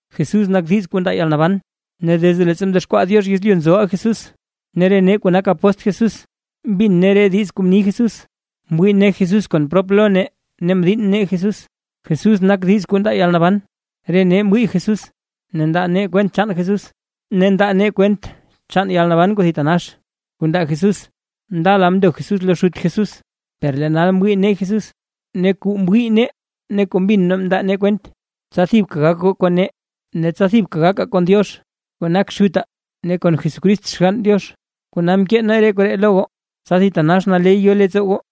Jesús nak diiz kuu ndaa yalnaban; ne desde leettsa mdexkwaa Diox yezlyu nzoʼa Jesús, ne re nee kuu nak apóstl Jesús mbin nee re diiz kuu mni Jesús, mwii nee Jesús kon prop lo nee ne mdiinn nee Jesús. Jesús nak diiz kuu ndaa yalnaban, re nee mwii Jesús, ne ndaa nee kwent chaan Jesús; ne ndaa nee kwent chaan yalnaban kuu thitanax kuu ndaa Jesús. Ndala mndo Jesús lo Xut Jesús, per lee nal mwii nee Jesús. Ne kuu mwii nee ne kuu mbin nee ndaa nee kwent, tsa thibka gak goo kon nee, ne tsa thibka gakaa kon Diox kuu nak Xutaa ne kon Jesucrist Xgann Diox. Kona mkee nee re koree lo goo tsa thitanax naley yo leettsoo goo.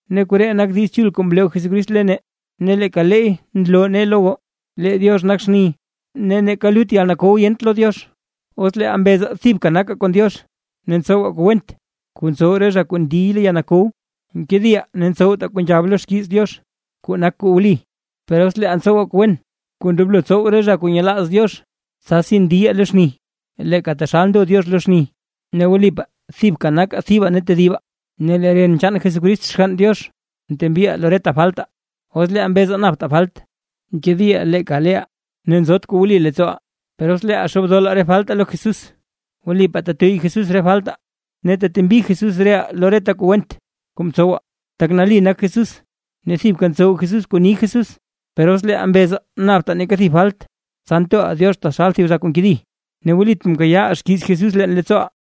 Ne koree nak Diiz Chul kuu mloo Jesucrist lo nee, ne leeka leey nloo nee lo goo; lee Diox nak xni, ne neeka lut yalkow yent lo Diox. Os leeʼaa mbezaa thibka nakaa kon Diox, ne ntsowaa kuu went kuu ntsow re zha kuu ndiy lo yalkow, nkediʼaa ne ntsowtaa kuu nzhab xkiiz Diox, kuu nak kuu wli. Per os leeʼaa ntsowaa kuu wen kuu ndoblo tsow re zha kuu nyelaaz Diox, tsasi ndiyaa lo xni, leeka taxal ndo Diox lo xni, ne wlipaa thibka nakaa thibaa ne tedibaa, ne lee ren chaan Jesucrist Xgann Diox, ntembiʼaa lo reta faltaa. Os leeʼaa mbezaa naptaa falt, nkediʼaa leeka leeʼaa ne nzot kuu wli leettsooʼaa. Per os leeʼaa xoobdola re faltaa lo Jesús, wlipaa tetuyy Jesús re faltaa ne tetembi Jesús reʼaa lo reta kuu went kuu mtsowaa, tak nali nak Jesús ne thibka ntsow Jesús kuu ni Jesús. Per os leeʼaa mbezaa naptaa neeka thib falt, tsa ntoʼaa Diox taxal thib zha kuu nkedi, ne wlit mkayaaʼaa xkiiz Jesús leen leettsooʼaa.